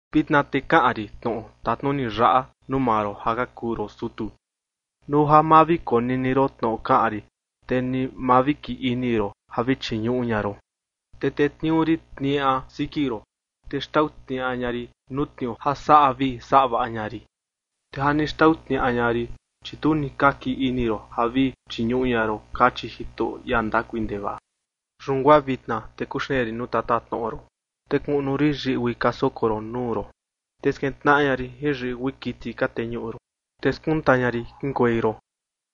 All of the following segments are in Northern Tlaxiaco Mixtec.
“Vitna te kaꞌan rin tnoꞌo tatnuni yaꞌa nuu maa ron ja ka kuu ron sutu. Nuu ja ma vi konini ron tnoꞌo kaꞌan rin, te ni ma vi kii ini ron ja vi chiñuꞌu ña ron, te tetniuu rin tniaꞌa siki ron, te xtau tniaꞌa ña rin nuu tniuu ja saꞌa vii saꞌa vaꞌa ña rin. Te ja ni xtau tniaꞌa ña rin, chi tu ni ka kii ini ron ja vi chiñuꞌu ña ron”, kachi Jitoꞌo, ia ndakui ndevaꞌa. “Yun guaa vitna, te kuxeen rin nuu tatatnoꞌo ron, te kuꞌnu rin yiꞌgui ka soko ron nuu ron, te skintnaꞌa ña rin jin yiꞌgui kiti ka teñuꞌu ron, te skunta ña rin kiꞌinkuei ron.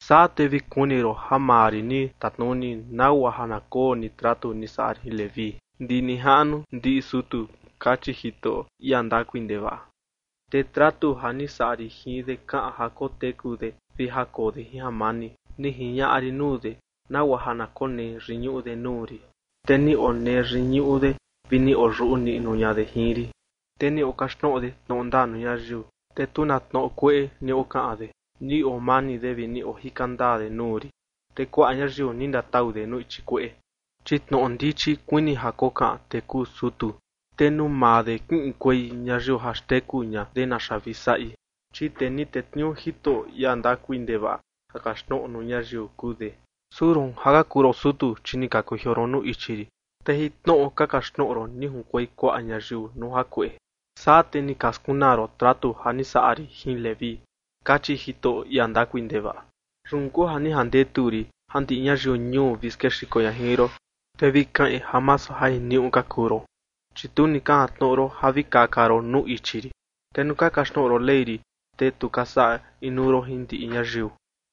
Saa te vi kuni ron ja maa rin ni tatnuni, nagua ja na koo ni tratu ni saꞌa rin jin Leví, ndi nijaꞌnu ndiꞌi sutu”, kachi Jitoꞌo, ia ndakui ndevaꞌa. “Te tratu ja ni saꞌa rin jin de kaꞌan ja koteku de vi ja koo de jin jamani, ni jiñaꞌa rin nuu de, nagua ja na konee yiñuꞌu de nuu rin, te ni onee yiñuꞌu de vi ni oyuꞌu niꞌnu ña de jin rin. Te ni okaxtnoꞌo de tnoꞌo ndaa nuu ñayiu, te tu na tnoꞌo kueꞌe ni okaꞌan de. Ni oo mani de vi ni ojika ndaa de nuu rin, te kuaꞌa ñayiu ni ndatau de nuu ichi kueꞌe. Chi tnoꞌo ndichi kuini ja kokaꞌan tee kuu sutu, te nuu maa de kiꞌinkuei ñayiu ja xteku ña de naxa vi saꞌi, chi tee ni tetniuu Jitoꞌo, ia ndakui ndevaꞌa, ja kaxtnoꞌo nuu ñayiu kuu de. ’Su roon ja ka kuu ron sutu, chi ni ka kujioo ron nuu ichi rin, te jin tnoꞌo ka kaxtnoꞌo ron ni junkuei kuaꞌa ñayiu nuu jakueꞌe. Saa, te ni ka skunaa ron tratu ja ni saꞌa rin jin Leví”, kachi Jitoꞌo, ia ndakui ndevaꞌa. “Yun kuu ja ni jandetu rin ja ndiꞌi ñayiu ñuu vi skexiko ña jin ron, te vi kaꞌin ja masu ja jiniuꞌu ka kuu ron, chi tu ni ka jantnoꞌo ron ja vi kaka ron nuu ichi rin, te nuu ka kaxtnoꞌo ron Ley rin, te tu ka saꞌa inuu ron jin ndiꞌi ñayiu”.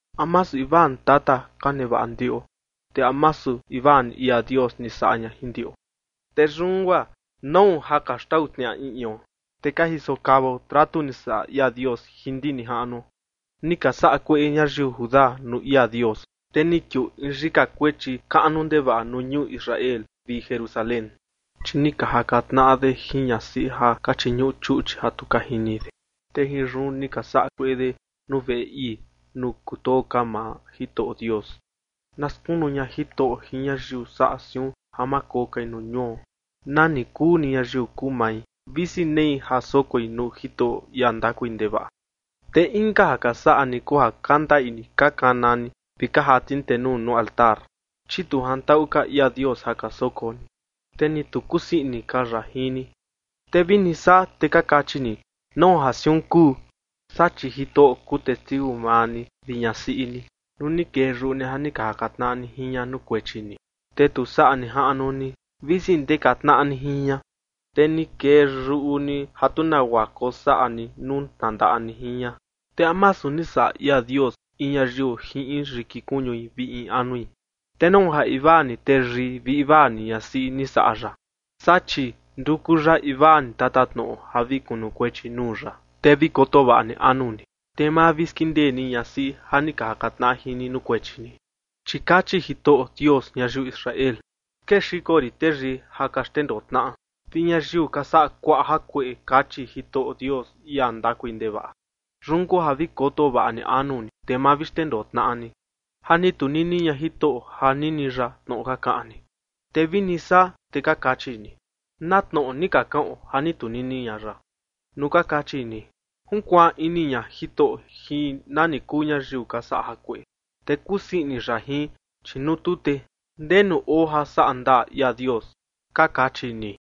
¿A masu invaa ni tata ka nevaꞌa ndiꞌo? ¿Te a masu invaa ni ia Dios ni saꞌa ña jin ndiꞌo? Te yun guaa, ¿nau ja ka xndaꞌu tnaꞌa in ion, te ka jiso kavao tratu ni saꞌa ia Dios jin ndi nijaꞌnuo? Ni ka saꞌa kueꞌe ñayiu Judá nuu ia Dios, te ni kiuu in yika kuechi kaꞌnu ndevaꞌa nuu ñuu Israel vi Jerusalén, chi ni ka jaka tnaꞌa de jin ñasiꞌi ja ka chiñuꞌu chuꞌchi ja tu ka jini de, te jin yun ni ka saꞌa kueꞌe de nuu veꞌe ii, nuu kutoo ka maa Jitoꞌo Dios. Na skunu ña Jitoꞌo jin ñayiu saꞌa siun ja ma koo kai nuu ñuo, nani kuu ni ñayiu kuu mai, visi nei ja sokoi nuu Jitoꞌo, ia ndakui ndevaꞌa. Te inka ja ka saꞌa ni kuu ja ka ndaꞌi ka kana ni vi ka jati ni tenuu ni nuu altar, chi tu jantaꞌu ka ia Dios ja ka soko ni, te ni tu kusii ini ka ya jin ni. Te vini saa, te ka kachi ni: “¿Nau ja siun kuu?” Saa, chi Jitoꞌo kuu testiu maa ni vi ñasiꞌi ni nuu ni kee yuꞌu ni ja ni ka jaka tnaꞌa ni jin ña nuu kuechi ni, te tu saꞌa nijaꞌnu ni, visi ndeka tnaꞌa ni jin ña, te ni kee yuꞌu ni ja tu nagua kosaꞌa ni nuu tnandaꞌa ni jin ña. ¿Te a masu ni saꞌa ia Dios in ñayiu jin in yiki kuñui vi in anui? ¿Te nau ja invaa ni teyii vi invaa ni ñasiꞌi ni saꞌa ya? Saa, chi nduku ya invaa ni tatatnoꞌo ja vi kunukuechi nuu ya. Te vi koto vaꞌa ni anu ni, te ma vi skindee ni ñasiꞌi ja ni ka jaka tnaꞌa jin ni nuu kuechi ni. Chi kachi Jitoꞌo Dios ñayiu Israel: “Skexiko rin teyii ja ka xndendoo tnaꞌa vi ñayiu ka saꞌa kuaꞌa jakueꞌe”, kachi Jitoꞌo Dios, ia ndakui ndevaꞌa. Yun kuu ja vi koto vaꞌa ni anu ni, te ma vi xndendoo tnaꞌa ni. Ja ni tunini ña Jitoꞌo ja nini ya tnoꞌo ka kaꞌan ni. Te vini saa, te ka kachi ni: “¿Na tnoꞌo ni ka kaꞌon ja ni tunini ña ya?” Nuu ka kachi ni: “Junkuaan ini ña Jitoꞌo jin nani kuu ñayiu ka saꞌa jakueꞌe, te kusii ini ya jin, chi nuu tu, ¿te ndenu oo ja saꞌa ndaa ia Dios?”, ka kachi ni.